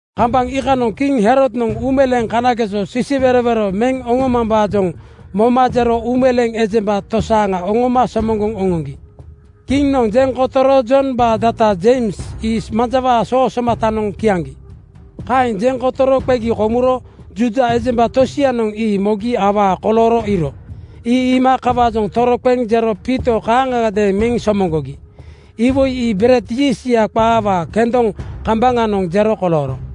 Kambaŋ iikanoŋ kiŋ Herodnoŋ uumeleeŋ kanageso sisiwerowero meŋ oŋomambaajoŋ moma jero uumeleeŋ ejemba tosaaŋa oŋoma somoŋgoŋ oŋoŋgi. Kiŋnoŋ jeŋ kotoro Jombaa data Jeims ii manjawaa soo somatanoŋ kiaŋgi. Kaeŋ jeŋ kotoro qegi komuro Juuda ejemba tosianoŋ ii mogi awaa kolooro iiro. Ii iima kawaajoŋ toroqeŋ jero Piito kaaŋagadeeŋ meŋ somoŋgogi. Iwoi ii bered yiistya qaawaa kendoŋ kambaŋanoŋ jero kolooro.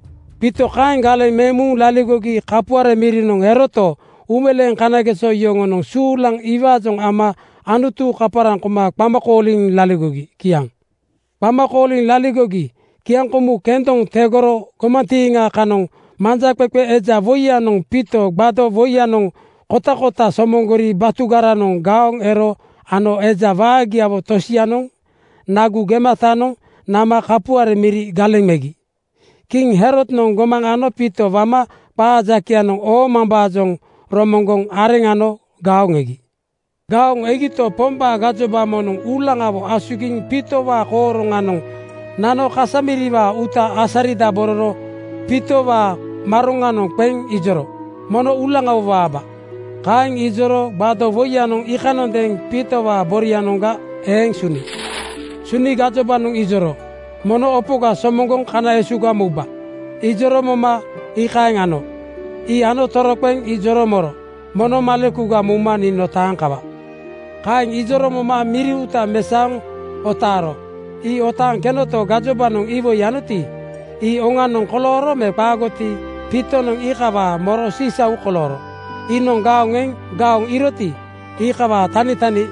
Piito kaeŋ galeŋ meŋ muŋ laligogi kapuare mirinoŋ eroto, uumeleeŋ kanageso yoŋonoŋ suulaŋ iwaajoŋ ama Anutu kaparaŋ koma qama kooliŋ laligogi. Kiaŋ. Qama kooliŋ laligogi kiaŋkomu (Passover) kendoŋ tegoro gomantiiŋa kanoŋ manjaqeqe eja woiyanoŋ Piito gbado (tape) woinoŋ kotakota somoŋgori batugaranoŋ gaoŋ ero ano eja waagiawo tosianoŋ nagu gematanoŋ nama kapuare miri galeŋ megi. Kiŋ Herodnoŋ gomaŋ ano Piito wama qaa jakeyanoŋ oomambaajoŋ romoŋgoŋ areŋ ano gaoŋ egi. Gaoŋ egito, Pombaa gajoba moŋnoŋ uulaŋawo asugiŋ Piitowaa kooroŋanoŋ nano kasa miriwaa uuta asaridabororo Piitowaa maroŋanoŋ qeŋ ijoro, “Mono uulaŋawo waaba.” Kaeŋ ijoro gbado (tape) woiyanoŋ iikanondeeŋ Piitowaa borianoŋga eeŋ suni. Suni gajobanoŋ ijoro, “Mono opoga somoŋgoŋ kana esuga mouba.” Ijoro moma iikaeŋ ano. Ii ano toroqeŋ ijoro moro, “Mono malekuga mouma nii notaaŋ kawa.” Kaeŋ ijoro moma miri uuta mesaoŋ otaaro. Ii otaaŋ kenoto, gajobanoŋ iwoi anoti, ii oŋanoŋ kolooro me qaagoti, Piitonoŋ iikawaajoŋ moro sisau kolooro. Iinoŋ gaoŋ eŋ gaoŋ iiroti, iikawaa tanitani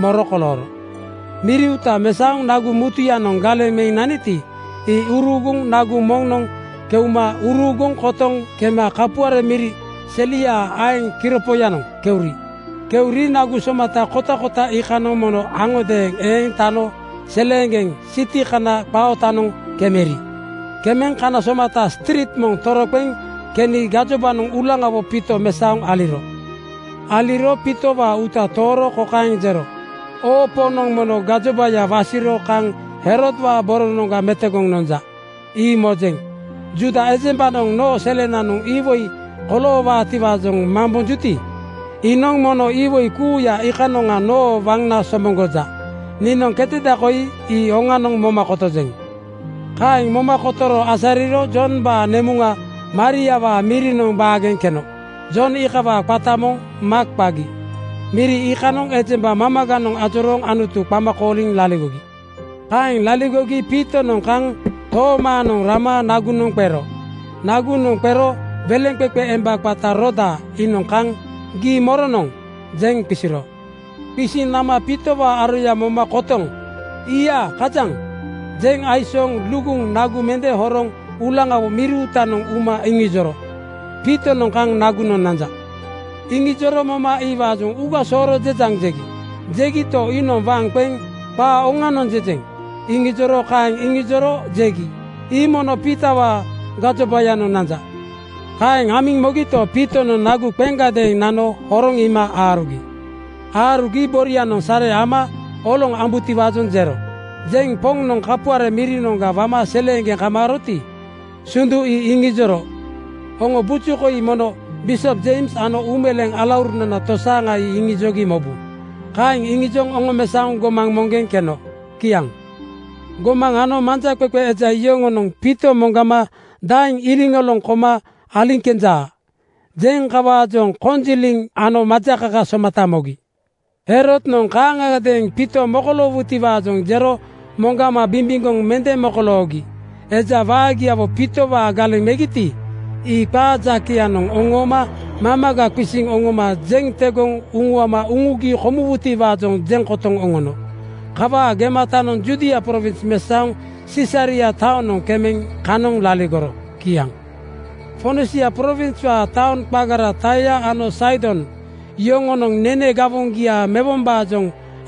moro kolooro. Miri uuta mesaoŋ nagu mutuyanoŋ galeŋ meŋ naniti, ii uruuguŋ nagu moŋnoŋ keuma uruuguŋ kotoŋ kema kapuare miri seliaa aeŋ kiropoyanoŋ keuri. Keuri nagu somata kotakota iikanoŋ mono aŋodeeŋ eeŋ tano seleeŋgeŋ siti kana qaa ootanoŋ kemeri. Kemeŋ kana somata striit moŋ toroqeŋ keni gajobanoŋ uulaŋawo Piito mesaoŋ aliro. Aliro Piitowaa uuta tooro kokaeŋ jero, “Oo Poŋnoŋ mono gajobaya wasiro kaŋ Herodwaa boronoŋga metogoŋ nonja, ii mojeŋ. Juuda ejembanoŋ noo selenanoŋ iwoi koloowaatiwaajoŋ mambonjuti, iinoŋ mono iwoi kuuya iikanoŋa noo waŋna somoŋgoja. Niinoŋ keteda koi ii oŋanoŋ moma kotojeŋ.” Kaeŋ moma kotoro asariro Jombaa nemuŋa Mariawaa mirinoŋ baageŋ keno. Jon iikawaa qata moŋ Maak qagi. Miri iikanoŋ ejemba mamaganoŋ ajorooŋ Anutu qama kooliŋ laligogi. Kaeŋ laligogi Piitonoŋ kaŋ toomaanoŋ nama nagunoŋ qero. Nagunoŋ qero weleŋqeqe emba qata Roda iinoŋ kaŋ “Gii moronoŋ?” jeŋ qisiro. Qisiŋ nama Piitowaa aroya moma kotoŋ “Ii-ia kajaŋ!” jeŋ aisooŋ luguŋ nagu mende horoŋ uulaŋawo miri uutanoŋ uma iŋijoro, “Piitonoŋ kaŋ nagunoŋ nanja.” Iŋijoro moma iwaajoŋ “Uuga sooro jejaŋ,” jegi. Jegito, iinoŋ waŋ qeŋ “Qaa oŋia jejeŋ!” iŋijoro. Kaeŋ iŋijoro jegi, “Ii mono Piitowaa gajobayanoŋ nanja.” Kaeŋ amiŋ mogito, Piitonoŋ nagu qeŋgadeeŋ nano horoŋ iima aarugi. Aarugi borianoŋ sare ama oloŋ ambutiwaajoŋ jero. Jeŋ Poŋnoŋ kapuare mirinoŋga wama seleeŋgeŋ kamaaroti, sundu ii iŋijoro, “Oŋo buju koi mono bisop Jeims ano uumeleeŋ alaurunana tosaaŋa ii iŋijogi mobu.” Kaeŋ iŋijoŋ oŋomesaoŋ gomaŋ moŋgeŋ keno. Kiaŋ. Gomaŋ ano manjaqeqe eja yoŋonoŋ Piito moŋgama “Daeŋ iliŋoloŋ koma aliŋ kenja?” jeŋ kawaajoŋ konjiliŋ ano majakaka somata mogi. Herodnoŋ kaaŋagadeeŋ Piito mokoloowutiwaajoŋ jero moŋgama bimbimgoŋ mende mokoloogi eja waagiawo Piitowaa galeŋ megiti, ii qaa jakeyanoŋ oŋooma mamaga qisiŋ oŋoma jeŋ tegoŋ uŋuama uŋugi komuwutiwaajoŋ jeŋ kotoŋ oŋono. Kawaa gematanoŋ Judia prowins mesaoŋ Sisaria taonoŋ kemeŋ kanoŋ laligoro. Kiaŋ. Fonisia prowinswaa taoŋ qagara Taia ano Saidon yoŋonoŋ nene gawoŋgia mewombaajoŋ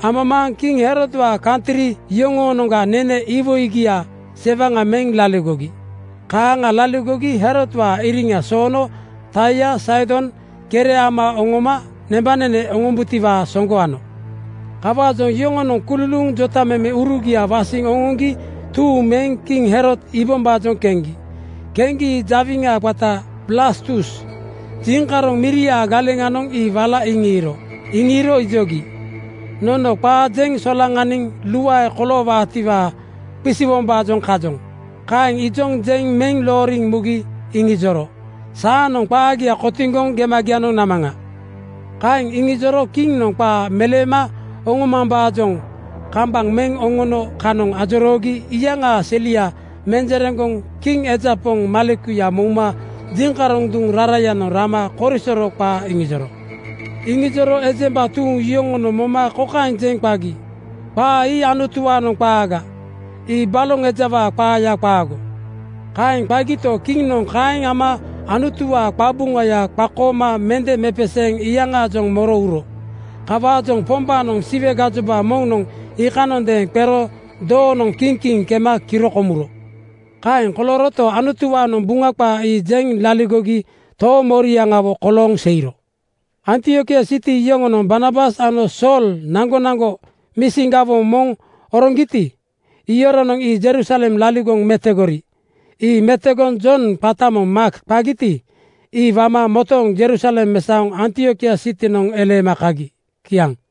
amamaaŋ kiŋ Herodwaa kantri yoŋoonoŋga nene iwoigia sewaŋa meŋ laligogi. Kaaŋa laligogi Herodwaa iriŋa soono Taia Saidon kere ama oŋoma nembanene oŋombutiwaa soŋgo ano. Kawaajoŋ yoŋonoŋ kululuuŋ jotamemeurugia wasiŋ oŋoŋgi tuuŋ meŋ kiŋ Herod iibombaajoŋ keŋgi. Keŋgi jawiŋa qata Blastus jiŋkaroŋ miriaa galeŋanoŋ ii wala iŋiiro. Iŋiiro ijogi, “Nono qaa jeŋ solaŋaniniŋ luae koloowaatiwaa qisiwombaajoŋ kajoŋ.” Kaeŋ ijoŋ jeŋ meŋ looriŋ mugi iŋijoro, “Saanoŋ qaagia kotiŋgoŋ gemagianoŋ namaŋa.” Kaeŋ iŋijoro kiŋnoŋ qaa meleema oŋomambaajoŋ kambaŋ meŋ oŋono kanoŋ ajoroogi iyaŋaa selia menjereŋgoŋ kiŋ eja poŋ malekuya mouma jiŋkaroŋ duŋ rarayanoŋ rama korisoro qaa iŋijoro. Iŋijoro ejemba tuuŋ yoŋonoŋ moma kokaeŋ jeŋ qagi, “Qaa ii Anutuwaanoŋ qaaga. Ii baloŋ ejawaa qaaya qaago.” Kaeŋ qagito, kiŋnoŋ kaeŋ ama Anutuwaa qabuŋaya qakooma mende mepeseeŋ iyaŋaajoŋ moro uro. Kawaajoŋ Pombaanoŋ Siwe gajoba moŋnoŋ iikanondeeŋ qero doonoŋ kiŋ kiŋ kema kiro komuro. Kaeŋ kolooroto, Anutuwaanoŋ Buŋa qaa ii jeŋ laligogi toomoriaŋawo kolooŋ seiro. Antiokia siti yoŋonoŋ Barnabas ano Sool naŋgonaŋgo misin gawoŋ moŋ oroŋgiti, iyoronoŋ ii Jerusalem laligoŋ metogori. Ii metegoŋ Jon qata moŋ Maak qagiti, ii wama motooŋ Jerusalem mesaoŋ Antiokia sitinoŋ eleema kagi. Kiaŋ.